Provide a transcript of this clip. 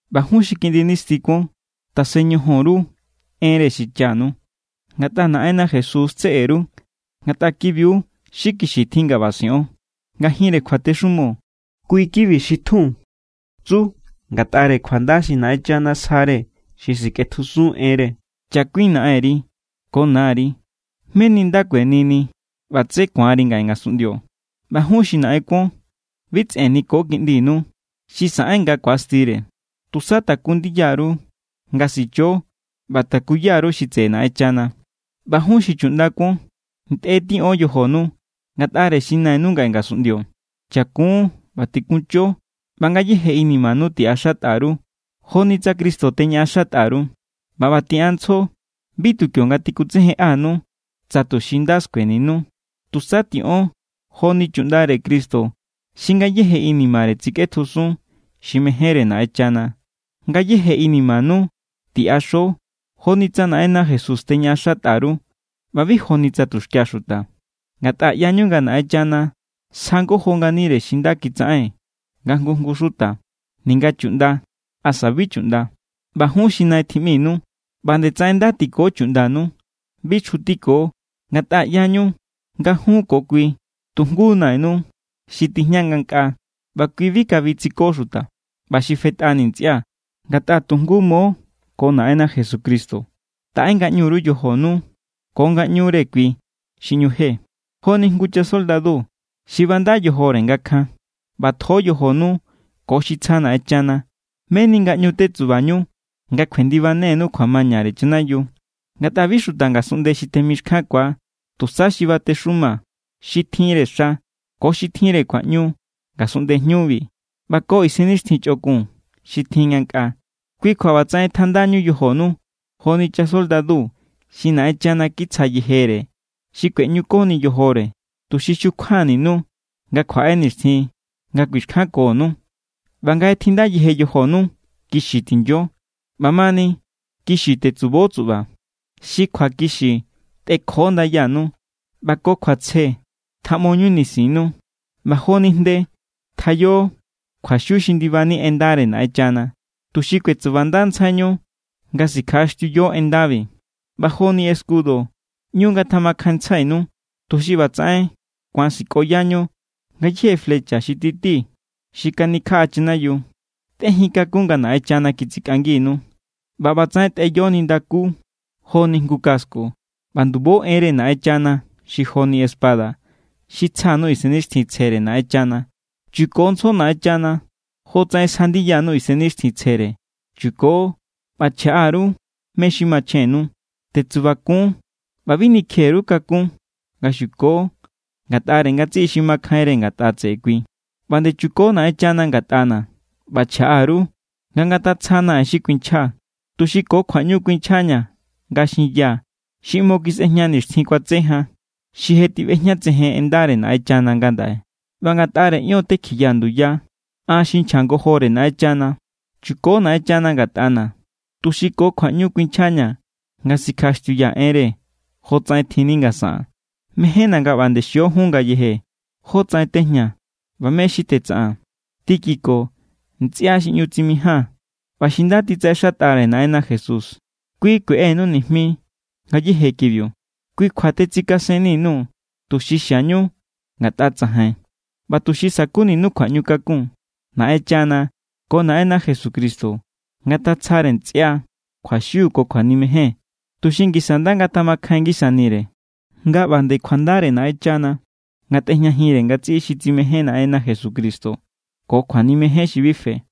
ꞌBa jun xi kiꞌndi nisti kuon, tasen ñojon_ru enre xichanu ngatꞌa Naꞌenna Jesús= tseꞌe_ru. Ngatꞌa ki=biu xi kixi tjin nga ꞌba siꞌon. Ngajinre kjuatexumo, kui= kibi xi tjun tsu ngatꞌare kjuanda xi Naꞌenchana sjare xi sikꞌetjusun enre: “Chakuin naꞌenri ko nari, meni nda kuenini ꞌba tsé ku̱anri ngaꞌe ngasunꞌndio.” ꞌBa jun xi naꞌen kuon, bi tsꞌen niko kiꞌndinu xi saꞌen nga ku̱astire. Tusa taku ndiya_ru nga sicho ꞌba takuya_ru xi tseꞌe Naꞌenchana. ꞌBa jun xi chuꞌnda kuon, ntꞌe tiꞌon yojonu ngatꞌare xi nainu ngaꞌe ngasunꞌndio. Chakun ꞌba tikuncho ꞌba ngayéje inimanu tiꞌaxatꞌa_ru, joni tsa Cristo teñaꞌaxatꞌa_ru. ꞌBa ꞌba tiꞌanntsjo, bi tu kionga tikutsejenꞌanu, tsa tuxi nda skueninu. Tusa tiꞌon joni chuꞌndare Cristo xi ngayéje inimare tsikꞌetjusun xi mejénre Naꞌenchana. Ngayéje inimanu tiꞌaxo joni tsa Naꞌenna Jesús teñaꞌaxatꞌa_ru ꞌba bi joni tsa tuxkia xuta. Ngatꞌa ꞌyañu nga Naꞌenchana sja ngojo nganire xi nda kitsaꞌen nga jngu jngu xuta, ninga chuꞌnda asa bi chuꞌnda. ꞌBa jun xi nai tjiꞌminu, ꞌba nde tsaꞌen nda tiko chuꞌndanu. Bi chjutiko. Ngatꞌa ꞌyañu nga jun ko kui tu jngu Nainu xi tijña ngankꞌaa ꞌba kui bi kabi tsiko xuta. ꞌBa xi fetꞌani ntsꞌia̱, ngatꞌa tu jngu mo ko Naꞌenna Jesucristo, taꞌe ngaꞌñu_ru yojonu ko ngaꞌñure kui xi ꞌñu je. Joni jngu chasoldadu xi banda yojore nga kjan, ꞌbatjo yojonu ko xi tsja Naꞌenchana, meni nga ꞌñu tetsubañu nga kjuendibanenu kjuamañare chanayiu. Ngatꞌa bi xuta ngasunꞌnde xi temixkjankua, tusa xi batexuma, xi tjinre xa, ko xi tjinre kjuaꞌñu ngasunꞌnde jñubi, ꞌba ko isennixtjin chꞌokun xi tjin ngankꞌaa. Kui kjua ꞌbatsaꞌen tjandañu yojonu joni chasoldadu xi Naꞌenchana kitsja yejere xi kueꞌñukoni yojore, tuxi xukjuaninu nga kjuaꞌe nixtjin nga kuixkjankonu. ꞌBa nga je tjinda yejenu yojonu, kixi tinyo. ꞌBamani, kixi tetsubo tsuꞌba. Xi kjuakixi tꞌekjo ndayanu ꞌba ko kjuatsje tjaꞌmoñu nisinnu. ꞌBa joni jnde, tjayo kjuaxiu xi ndibanni en ndare Naꞌenchana, tuxi kuetsubandantsjaiñu nga sikjaꞌaxtiuyo en ndabi. ꞌBa joni escudo, ꞌñu ngatjamakjainntsjainu, tuxi ꞌbatsaꞌen ku̱an sikꞌoyañu ngayéje flecha xi titi xi kanikjaꞌa chanayiu. Tꞌejintakun nga Naꞌenchana kitsikꞌanginu, ꞌba ꞌbatsaꞌen tꞌeyo nindakú joni jngu casco. ꞌBa ndubo enre Naꞌenchana xi joni espada xi tsja_nuu̱ Isennixtjintsjere Naꞌenchana. Chukontsjo Naꞌenchana jotsaꞌen sja ndiyanu Isennixtjintsjere. Chuko ꞌba chjaꞌa_ru mé= xi machjennu. Tetsubakun ꞌba bi nikje_ru kakún nga xuko ngatꞌare ngatsiꞌi xi makjainre ngatꞌa tseꞌe kui. ꞌBa nde chuko Naꞌenchana ngatꞌana̱ ꞌba chjaꞌa_ru nga ngatatsjana̱ en xi kuinchjaa̱, tuxi ko kjuaꞌñu kuinchjaña̱ nga xinyaa̱ xi ꞌmo kisꞌejña nixtjin kuatse jan, xi je tiꞌbejñatsejen en ndare Naꞌenchana ngandaꞌe. ꞌBa ngatꞌare ion tekjiyaa̱ nduya an xi nchja ngojore Naꞌenchana. Chuko Naꞌenchana ngatꞌana̱, tuxi ko kjuaꞌñu kuinchjaña̱ nga sikjaꞌaxtiuyaa̱ enre, jotsaꞌen tjinni nga saꞌaa̱n. Mejénna̱ nga ꞌba nde xio jun ngayeje jótsaꞌen tejñaa̱ ꞌba mé= xi tetsaꞌaa̱n. Tíquico, ntsꞌia xi ꞌñu tsimijaa̱n ꞌba xi nda titsaꞌexatꞌare Naꞌenna Jesús, kui kueꞌenu nijmi ngayéje kibiu. Kui= kjua tetsikasenni_nuu̱, tuxi xiañu ngatꞌa tsajain ꞌba tuxi sa̱kuninu kjuaꞌñukakun. Naꞌenchana ko Naꞌenna Jesucristo ngatatsjare ntsꞌia kjuaxiu ko kjuanimejen, tuxi ngisa nda ngatjamakjain ngisanire. ꞌBa nde kjuandare Naꞌenchana ngatꞌejñajinre ngatsiꞌi xi tsimején Naꞌenna Jesucristo ko kjuanimejen xi bi fe.